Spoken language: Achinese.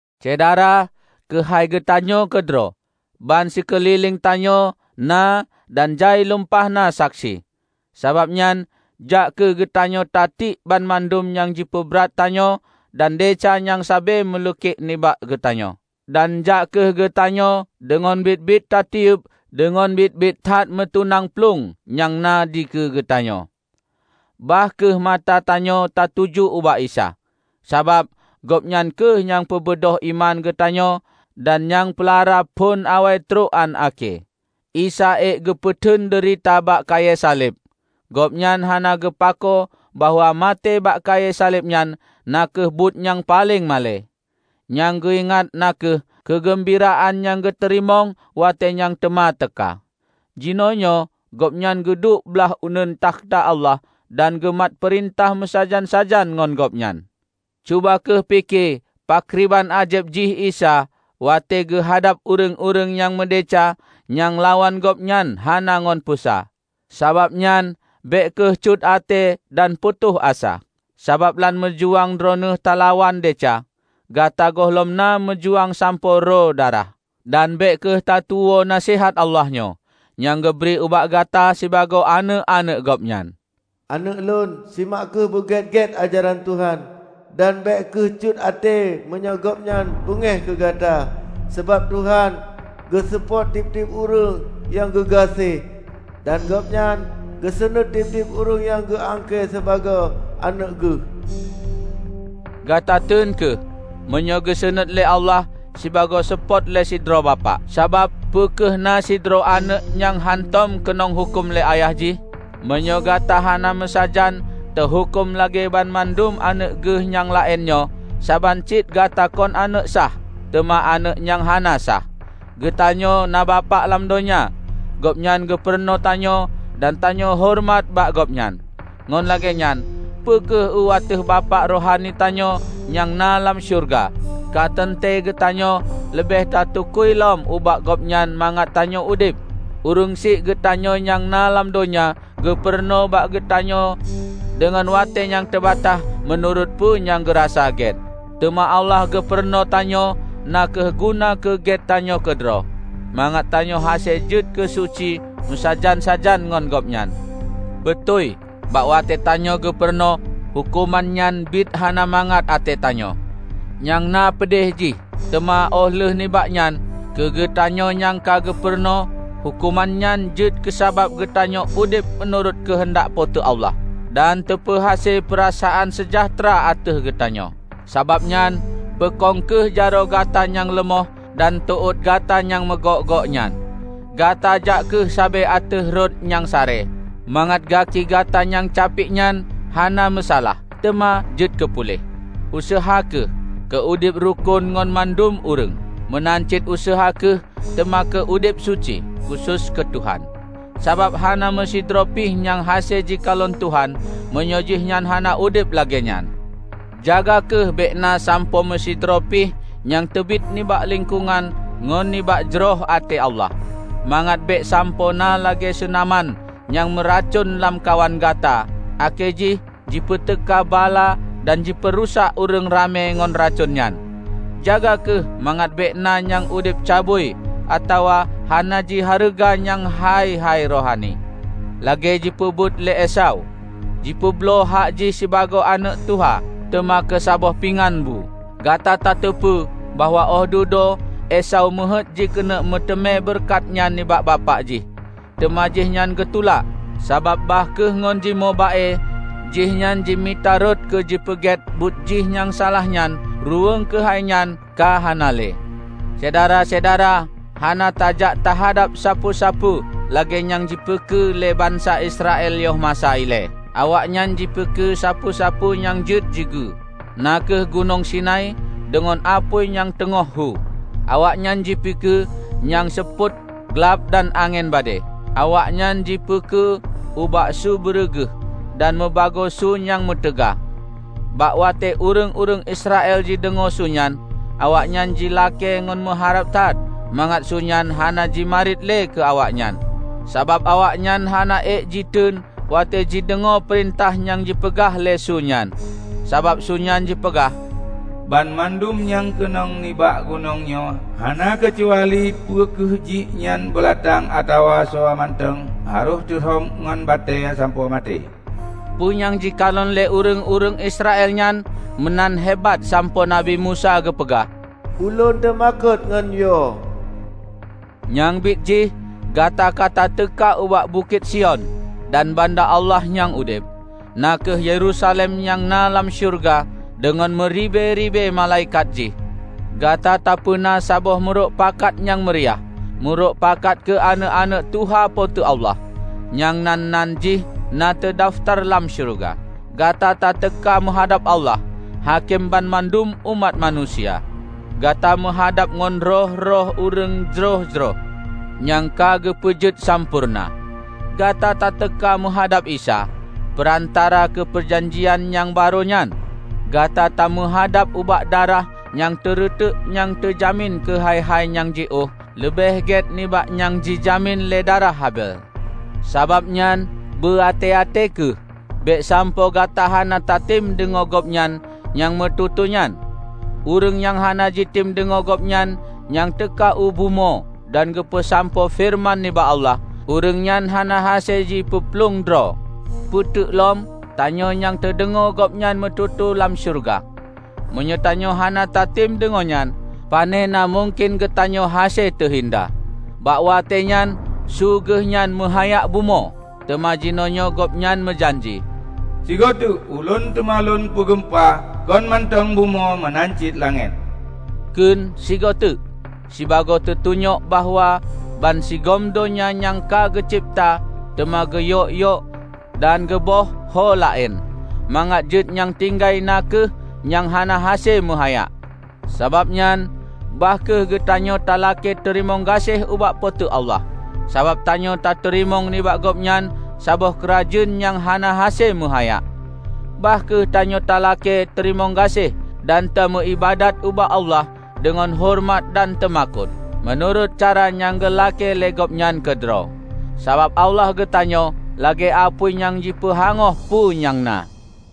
Syedara, keuhai geutanyoe keudroe, ban sikeulileng tanyoe na dan jai lumpah na saksi! Sabab nyan, jak kheueh geutanyoe tatiek banmandum nyang jipeubrat tanyoe dan desya nyang sabe meuleukek nibak geutanyoe. Dan jak kheueh geutanyoe deungon biet-biet tatiyeub deungon biet-biet that meutunang plueng nyang na dikeue geutanyoe. Bah kheueh mata tanyoe tatuju ubak Isa, sabab Gobnyan kheueh nyang peubeudôh iman geutanyoe dan nyang peulara phon awai trok án akhé. Isa ék geupeuteun deurita bak kayée saleb! Gobnyan hana geupakoe bahwa maté bak kayée saleb nyan na kheueh buet nyang paleng malée. Nyang geuingat na kheueh keugeumbiraan nyang geuteurimong watée nyang teuma teuka. Jinoenyoe Gobnyan geuduek blaih uneuen takhta Allah dan geumat peurintah meusajan-sajan ngon Gobnyan. Cuba kheueh pike pakriban ázeb jih Isa watée geuhadab ureuëng-ureuëng nyang meudesya nyang lawan Gobnyan hana ngon peusa! Sabab nyan bék kheueh cut até dan putôh asa. Sabab lam meujuang droeneueh talawan desya, gata gohlom na meujuang sampoe roe darah. Dan bék kheueh tatuwoe naseuhat Allah nyoe, nyang geubri ubak gata sibagoe aneuëk-aneuëk Gobnyan: "Aneuëk Lôn, simak kheueh beugét-gét ajaran Tuhan, dan bék kheueh cut até meunyoe Gobnyan beungéh keu gata. Sabab Tuhan geuseupôt tieb-tieb ureuëng nyang geugaséh, dan Gobnyan geusunuét tieb-tieb ureuëng nyang geu angkée sibagoe aneuëk Geuh." Gata teun kheueh meunyoe geusunuét lé Allah sibagoe seupôt lé sidroe bapak. Sabab, peu kheueh na sidroe aneuëk nyang hántom keunong huköm lé ayah jih? Meunyoe gata hana meusajan teuhuköm lagée banmandum aneuëk geuh nyang laén nyoe saban cit gata kon aneuëk sah, teuma aneuëk nyang hana sah. Geutanyoe na bapak lam donya. Gobnyan geupurunoe tanyoe, dan tanyoe horeumat bak gobnyan. Ngon lagée nyan, peu kheueh u ateueh Bapak rohani tanyoe nyang na lam syeuruga, ka teuntée geutanyoe leubeh tatukui lom ubak Gobnyan mangat tanyoe udeb. Ureuëng syiek geutanyoe nyang na lam donya geupurunoe bak geutanyoe deungon watée nyang teubataih, meunurot peue nyang geurasa gét. Teuma Allah geupurunoe tanyoe na kheueh guna keu gét tanyoe keudroe, mangat tanyoe hase jeuet keusuci meusajan-sajan ngon Gobnyan. Beutôi bak watée tanyoe geupurunoe, huköman nyan biet hana mangat até tanyoe, nyang na peudeh jih. Teuma óh lheueh nibak nyan, keugeutanyoe nyang ka geupurunoe, huköman nyan jeuet keusabab geutanyoe udeb meunurot keuheundak Po teu Allah, dan teupeuhase peurasaan seujahteura ateueh geutanyoe. Sabab nyan, peukong kheueh jaroe gata nyang leumoh dan teuôt gata nyang meugok-gok nyan! Gata jak kheueh sabe ateueh rot nyang sare, mangat gaki gata nyang capiek nyan hana meusalah, teuma jeuet keu puléh. Useuha kheueh keu udeb rukon ngon mandum ureuëng. Meunan cit useuha kheueh teuma keu udeb suci, khusos keu Tuhan. Sabab hana meusidroe pi nyang hase jikalon Tuhan meunyoe jihnyan hana udeb lagée nyan. Jaga kheueh bék na sampoe meusidroe pi nyang teubiet nibak lingkongan ngon nibak jroh até Allah, mangat bék sampoe na lagée seunaman nyang meuracon lamkawan gata akhé jih jipeuteuka bala dan jipeurusak ureuëng ramé ngon racon nyan. Jaga kheueh mangat bék na nyang udeb cabui atawa hana jihareuga nyang hai-hai rohani, lagée jipeubuet lé Esau. Jipeubloe hak jih sibagoe aneuëk tuha, teuma keu saboh pingan bu. Gata tateupeue bahwa óh dudoe Esau meuheuét jikeuneuk meuteumé beureukat nyan nibak bapak jih, teuma jihnyan geutulak. Sabab bah kheueh ngon jimoe ba-e jihnyan jimita rot keu jipeugét buet jih nyang salah nyan, ruweueng keuhai nyan ka hana lé. Syedara-syedara hana tajak tahadab sapeue-sapeue lagée nyang jipeukeue lé bansa Israel yoh masa ilée. Awaknyan jipeukeue sapeue-sapeue nyang jeuet jigeue, na kheueh Gunong Sinai deungon apui nyang teungoh hu; awaknyan jipeukeue nyang seupôt, glab dan angén badée; awaknyan jipeukeue ubak su beureuguih, dan meubagoe su nyang meutaga. Bak watée ureuëng-ureuëng Israel jideungoe su nyan, awaknyan jilakée ngon meuharab that mangat su nyan hana jimarit lé keu awaknyan. Sabab awaknyan hana ék jiteun watée jideungoe peurintah nyang jipeugah lé su nyan. Sabab su nyan jipeugah, "Banmandum nyang keunong nibak gunong nyoe, hana keucuali peu kheueh jih nyan beulatang atawa soe mantong, harôh teu rhom ngon batée sampoe maté." Peue nyang jikalon lé ureuëng-ureuëng Israel nyan meunan hebat sampoe Nabi Musa geupeugah, "Ulôn teumakot ngon yo!" Nyang biet jih, gata ka tateuka ubak Bukét Sion dan banda Allah nyang udeb, na kheueh Yerusalem nyang na lam syeuruga deungon meuribée-ribée malaikat jih. Gata tapeuna saboh meurokpakat nyang meuriah -- meurok pakat keu aneuëk-aneuëk tuha Po teu Allah, nyang nan-nan jih na teudafeutar lam syeuruga. Gata tateuka meuhadab Allah, Hakém banmandum umat manusia. Gata meuhadab ngon roh-roh ureuëng jroh-jroh, nyang ka geupeujeuet sampoereuna. Gata tateuka meuhadab Isa, peurantara keu peujanjian nyang barô nyan; gata tameuhadab ubak darah nyang teureutek nyang teujamin keu hai-hai nyang jiôh leubeh gét nibak nyang jijamin lé darah Habel. Sabab nyan, beu até-até kheueh, bék sampoe gata hana tatem deungoe Gobnyan nyang meututoe nyan. Ureuëng nyang hana jitem deungoe Gobnyan nyang teuka u bumoe dan geupeusampoe feureuman nibak Allah, ureuëng nyan hana hase jipeuplueng droe. Peuteuk lom tanyoe nyang tadeungoe Gobnyan meututoe lam syeuruga! Meunyoe tanyoe hana tatem deungoe nyan, panena mungken geutanyoe hase teuhinda! Bak watée nyan su Geuhnyan meuhayak bumoe. Teuma jinoenyoe Gobnyan meujanji, "Sigoe teuk, Ulôn teuma Lôn peugeumpa kon mantong bumoe meunan cit langét." Kheun "sigoe teuk" sibagoe teutunyok bahwa bansigom donya nyang ka geucebta teuma geuyok-yok dan geuböih ho laén, mangat jeuet nyang tinggai na kheueh nyang hana hase meuhayak. Sabab nyan, bah kheueh geutanyoe talakée teurimong gaséh ubak Po teu Allah, sabab tanyoe tateurimong nibak Gobnyan saboh keurajeuen nyang hana hase meuhayak. Bah kheueh tanyoe talakée teurimong gaséh dan tameu iébadat ubak Allah deungon horeumat dan teumakot, meunurot cara nyang geulakée lé Gobnyan keudroe. Sabab Allah geutanyoe lagée apui nyang jipeuhangôh peue nyang na.